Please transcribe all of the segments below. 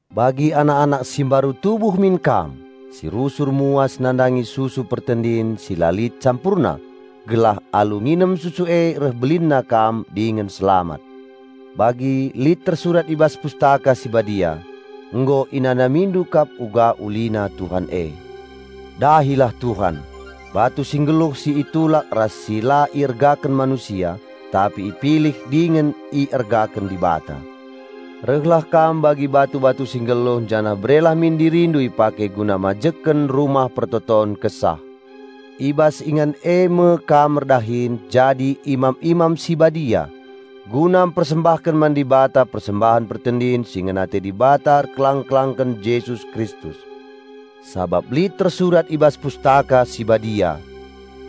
Bagi anak-anak si mbaru tubuh min kam, si rusur muas nandangi susu pertendin si la lit campurna, gelah alu nginem susu e reh belinna kam dingen selamat. Bagi lit tersurat i bas Pustaka Si Badia, "Nggo inanamindu kap uga ulina Tuhan e." Dahilah Tuhan, batu si nggeluh si itulak ras si la iergaken manusia, tapi ipilih dingen iergaken Dibata. Rehlah kam bagi batu-batu si nggeluh janah berelah min dirindu ipake guna majekken rumah pertoton kesah. I bas ingan e me kam erdahin jadi imam-imam si badia, guna mpersembahken man Dibata persembahen pertendin si ngena ate Dibata erkelang-kelangken Jesus Kristus. Sabap lit tersurat i bas Pustaka Si Badia,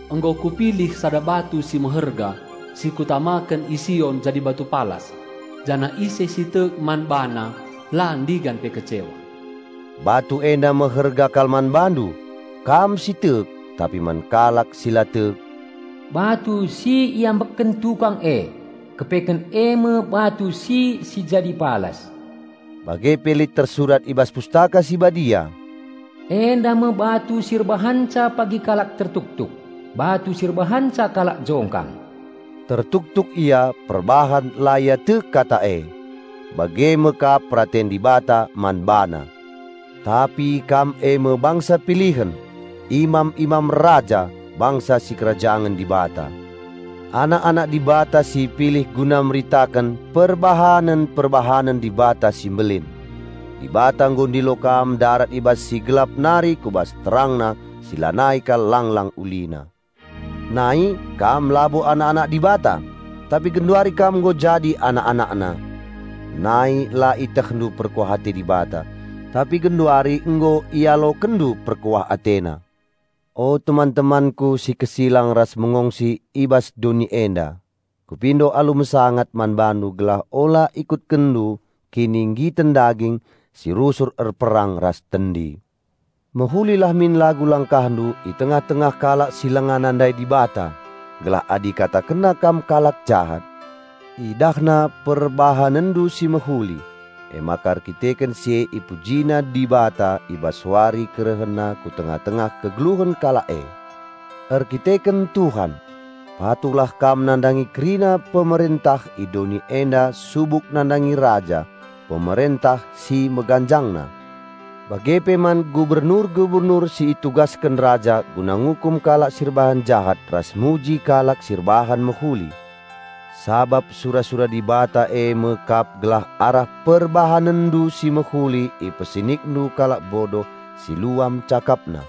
"Nggo kupilih sada batu si meherga, si kutamaken i Sion jadi batu palas, janah ise si tek man BaNa, la ndigan pe kecewa." Batu enda meherga kal man bandu, kam si tek. Tapi man kalak si la tek, "Batu si iambekken tukang e, kepeken e me batu si si jadi palas." Bage pe lit tersurat i bas Pustaka Si Badia, "Enda me batu si erbahanca pagi kalak tertuktuk, batu si erbahanca kalak jongkang." Tertuktuk ia perbahan la ia tek kata e. Bage me kap peraten Dibata man bana. Tapi kam e me bangsa pilihen, imam-imam Raja, bangsa sikerajangen Dibata, anak-anak Dibata si ipilih guna meritaken perbahanen-perbahanen Dibata si mbelin. Dibata nggo ndilo kam ndarat i bas si gelap nari ku bas TerangNa si lanai kal langlang ulina. Nai kam labo anak-anak Dibata, tapi genduari kam nggo jadi anak-AnakNa. Nai la ietehndu perkuah ate Dibata, tapi genduari nggo ialokenndu perkuah AteNa. O teman-temanku si kesilang ras mengongsi i bas doni enda, kupindo alu mesangat man bandu gelah ula ikutkenndu kinigiten daging si rusur erperang ras tendi. Mehulilah min lagu langkahndu i tengah-tengah kalak si langa nandai Dibata, gelah adi ikatakennandu kalak jahat, idahna perbahanenndu si mehuli, emaka erkiteken si e ipujina Dibata i bas wari KerehenNa ku tengah-tengah kegeluhen kalak e. Erkiteken Tuhan, patuhlah kam nandangi kerina pemerentah i doni enda subuk nandangi raja, pemerentah si meganjangna, bage pe man gubernur-gubernur si itugasken raja guna ngukum kalak si erbahan jahat ras muji kalak si erbahan mehuli. Sabap sura-sura Dibata e me kap gelah arah perbahanenndu si mehuli ipesinikndu kalak bodoh si luam cakapna.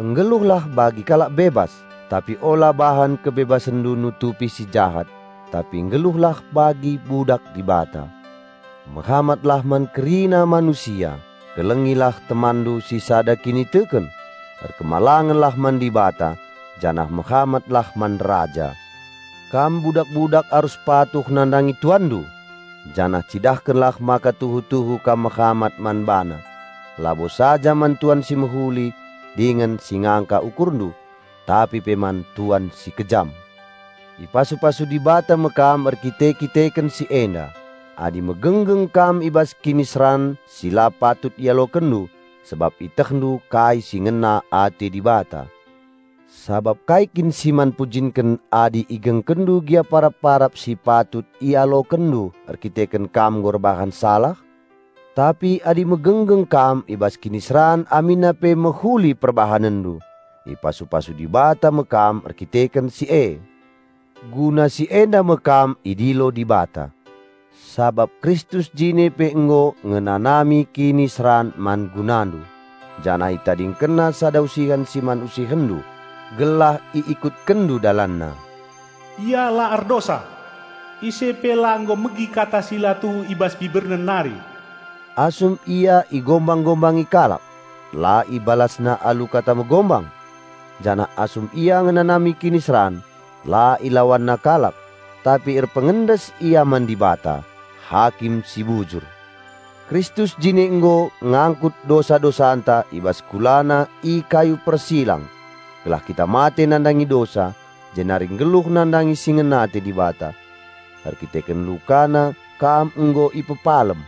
Nggeluhlah bagi kalak bebas; tapi ula bahan kebebasenndu nutupi si jahat, tapi nggeluhlah bagi budak Dibata. Mehamatlah man kerina manusia, kelengilah temanndu si sada kiniteken, erkemalangenlah man Dibata, janah mehamatlah man raja. Kam budak-budak arus patuh nandangi tuanndu, janah cidahkenlah maka tuhu-tuhu kam mehamat man bana, labo saja man tuan si mehuli dingen si ngangka ukurndu, tapi pe man tuan si kejam. Ipasu-pasu Dibata me kam erkite-kiteken si enda, adi megenggeng kam i bas kiniseran si la patut ialokenndu, sabap ietehndu kai si ngena ate Dibata. Sabap kai kin si man pujinken adi igengkenndu gia parap-parap si patut ialokenndu erkiteken kam nggo erbahan salah? Tapi adi megenggeng kam i bas kiniseran aminna pe mehuli perbahanenndu, ipasu-pasu Dibata me kam erkiteken si e. Guna si enda me kam idilo Dibata; sabap Kristus jine pe nggo ngenanami kiniseran man gunandu, janah ItadingkenNa sada usihen si man usihenndu, gelah iikutkenndu DalanNa. Ia la erdosa. Ise pe la nggo megi kata si la tuhu i bas BiberNa nari. Asum Ia igombang-gombangi kalak, la IbalasNa alu kata megombang. Janah asum Ia ngenanami kiniseran, la IlawanNa kalak, tapi erpengendes Ia man Dibata, Hakim si bujur. Kristus jine nggo ngangkut dosa-dosanta i bas KulaNa i kayu persilang, gelah kita mate nandangi dosa, jenari nggeluh nandangi si ngena ate Dibata. Erdandanken LukaNa, kam nggo ipepalem.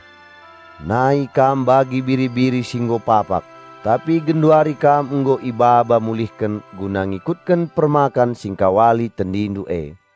Nai kam bagi biri-biri si nggo papak, tapi genduari kam nggo ibaba mulihken guna ngikutken Permakan Singkawali tendindu e.